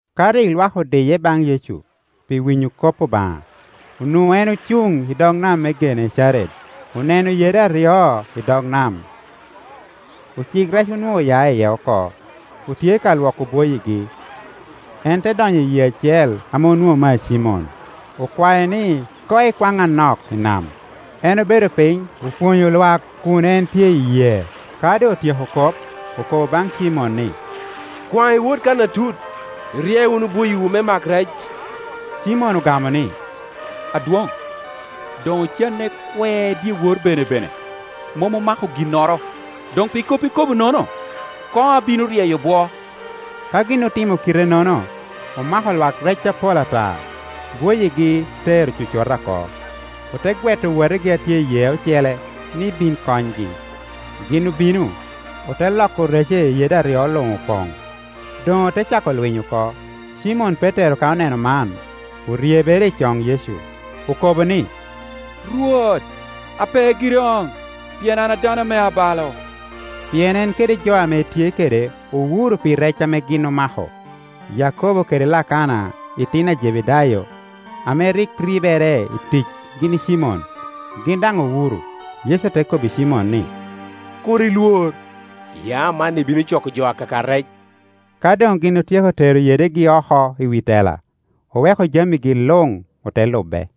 Ka rik lwak odiye baŋ Yecu pi winyo kop Obaŋa, onwoŋo en ocuŋ i dog nam me Genecaret. Oneno yede aryo i dog nam; ocik rec onwoŋo oya iye oko, otye ka lwoko bwoyigi. En te donyo i yee acel ame onwoŋo mea Cimon, okwae ni koŋ ekwaŋ anok i nam. En obedo piny, opwonyo lwak kun en tye i yee. Ka doŋ otyeko kop, okobo baŋ Cimon ni, “Kwaŋ iwot kan atut, irye wunu bwoyiwu me mak rec.” Cimon ogamo ni, “Adwoŋ, doŋ ocanne kwe dyewor benebene, mom omako ginnoro, doŋ pi kop ikobonono, koŋ abino ryeyo bwo.” Ka gin otimo kite-nono, omako lwak rec apol ata, bwoyigi te ero cocota oko. Ote gweto owotegi a tye i yee ocele ni bin konygi. Gin obino, ote loko rece i yede aryo luŋ opoŋ, doŋ ote cako lwiny oko. Cimon Petero ka oneno man, oryebere i coŋ Yecu, okobo ni, “Rwot, ape giri okoŋ, pien an dano ame abalo.” Pien en kede jo ame etye kede owuro pi rec ame gin omako; Yakobo kede Lakana itino a Jebedayo, ame rik ribere i tic gin i Cimon, gin daŋ owuro. Yecu te kobbi Cimon ni, “Kur ilwor; ya amanni ibino coko jo akaka rec.” Ka doŋ gin otyeko tero yedegi oko i wi tela, oweko jamigi luŋ, ote lube.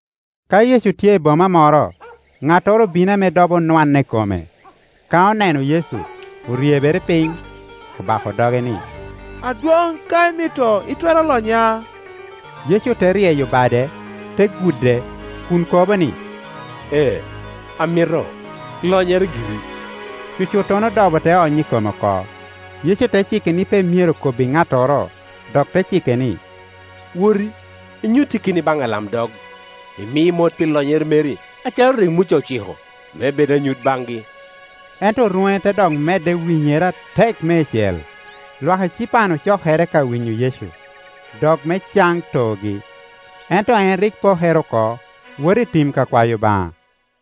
Ka Yecu tye i boma moro, ŋattoro obino ame dobo onwanne i kome. Ka oneno Yecu, oryebere piny, obako doge ni, “Adwoŋ, ka imito, itwero lonya.” Yecu te ryeyo bade, te gude, kun kobo ni, “Ee, amito; lonyere giri.” Cucuttono dobo te ony i kome oko. Yecu te cike ni pe myero kobbi ŋattoro. Dok te cike ni, “Woti, inyutte keni baŋ alamdog, imi mot pi lonyere meri, acalo rik Muca ociko, me bed anyut baŋgi.” Ento rwoŋe te dok medde winyere atek meicel. Lwak ecipan ocokere ka winyo Yecu, dok me can toogi. Ento en rik pokere oko, woto i tim kakwayo Obaŋa.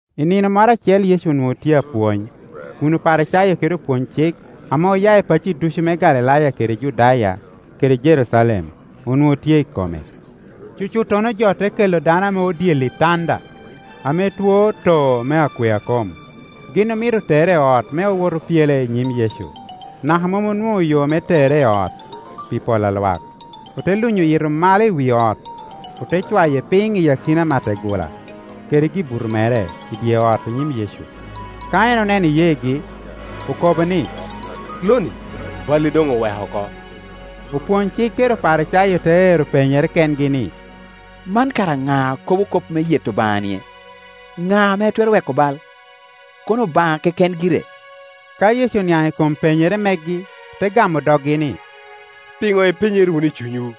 I nino moro acel Yecu onwoŋo tye apwony, kun Oparicayo kede opwonycik, ame oya i pacci ducu me Galilaya kede Judaya kede Jerucalem, onwoŋo tye i kome. Cucuttono jo te kela dano ame odyelo i tanda, ame two too me akwea kom. Gin omito tere i ot me owot opyele i nyim Yecu, naka mom onwoŋo yo me tere i ot, pi pol a lwak. Ote lunyo yito malo i wi ot, ote cwaye piny i akina mategula kede gibuto mere i dye ot i nyim Yecu, Ka en oneno iyeegi, okobo ni, “Lo-ni, balli doŋ oweko oko.” Opwony-cik kede Oparicayo te ero penyere kengi ni, “Man kara ŋa a kobo kop me yeto Obaŋa-nie? Ŋa ame twero weko bal, kono Obaŋa keken gire?” Ka Yecu oniaŋ i kom penyere megi, te gamo doggi ni, “Pino ipenyere wunu i cunywu?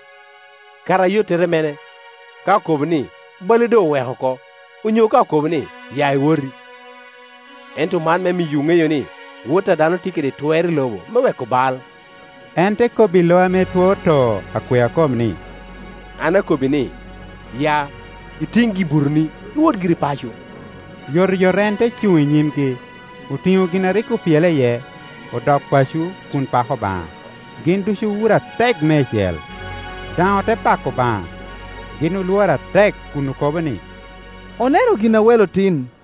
Kara ayottere mene, ka okobo ni, ‘Bali doŋ oweko oko’, onyo ka okobo ni, ‘Ya iwoti?’ Ento man me miyowu ŋeyo ni, Wot a dano tye kede twer i lobo me weko bal,” en te kobbi lo ame two too akwea kom ni, “An akobbi ni, ya, itiŋ gi-butoni, iwot giri paco.” Yotoyot en te cuŋ i nyimgi, otiŋo gin a rik opyele iye, odok paco kun pako Obaŋa. Gin ducu owuro atek meicel, daŋ ote pako Obaŋa; gin olworo atek kun okobo ni, “Oneno gin a welo tin.”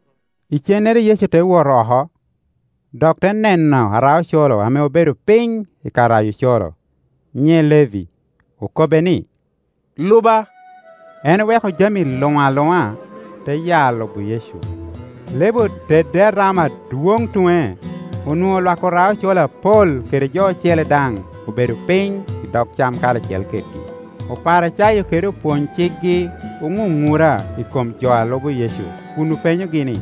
Icennere Yecu te wot oko, dok te neno ara-ocoro ame obedo piny i ka rayo ocoro, nyiŋe Levi; okobbe ni, “Luba.” En oweko jami luŋ aluŋa, te ya lubo Yecu. Levi otedde arama adwoŋ tuŋe; onwoŋo lwak ora-ocoro apol kede jo ocele daŋ obedo piny i dog cam karacel kedgi. Oparicayo kede opwony-cikgi oŋuŋura i kom jo a lubo Yecu kun openyogi ni,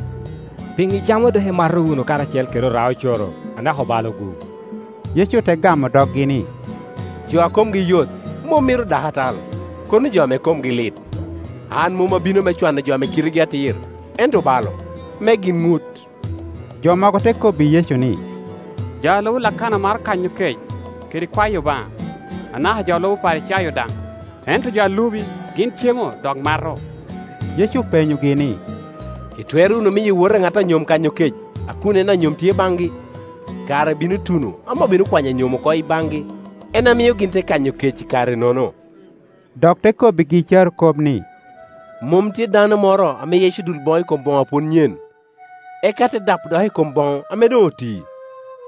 “Piŋo icamo dok imato wunu karacel kede ora-ocoro anaka obalo-gu?” Yecu te gamo doggi ni, “Jo a komgi yot mom mito dakatal, kono jo ame komgi lit. An mom abino me cwano jo ame kitegi atir, ento obalo, me gin ŋut.” Jo mogo te kobbi Yecu ni, “Jo a lubo Lakana maro kanyo kec, kede kwayo Obaŋa, anaka jo a lubo Oparicayo daŋ, ento jo a lubi gin cemo dok mato.” Yecu openyogi ni, “Itwero wunu miyo owote a ŋat a nyom kanyo kec a kun en anyom tye baŋgi? Kare bino tuno ame obino kwanyo anyom oko i baŋgi, en a mio gin te kanyo kec i kare-nono.” Dok te kobbigi carokop ni, “Mom tye dano moro ame yeco dul boŋo i kom boŋo a pwod nyen, eka te dapo dok i kom boŋo ame doŋ oti.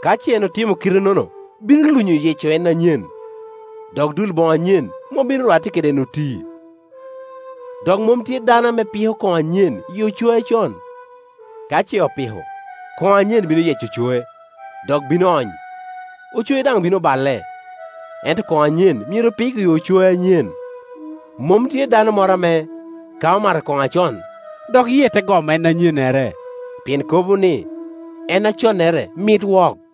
Ka ce en otimo kite-nono, bino lunyo yeco en anyen, dok dul boŋo anyen mom bino rwatte kede en oti. Dok mom tye dano ame piko koŋo anyen i ocoe acon; ka ce opiko, koŋo anyen bino yeco ocoe, dok bino ony, ocoe daŋ bino baile. Ento kono anyen myero pik i ocoe anyen. Mom tye dano moro ame, ka omato kono acon, dok yie te gomo en anyennere, pien kobo ni, ‘En aconnere mit wok.’”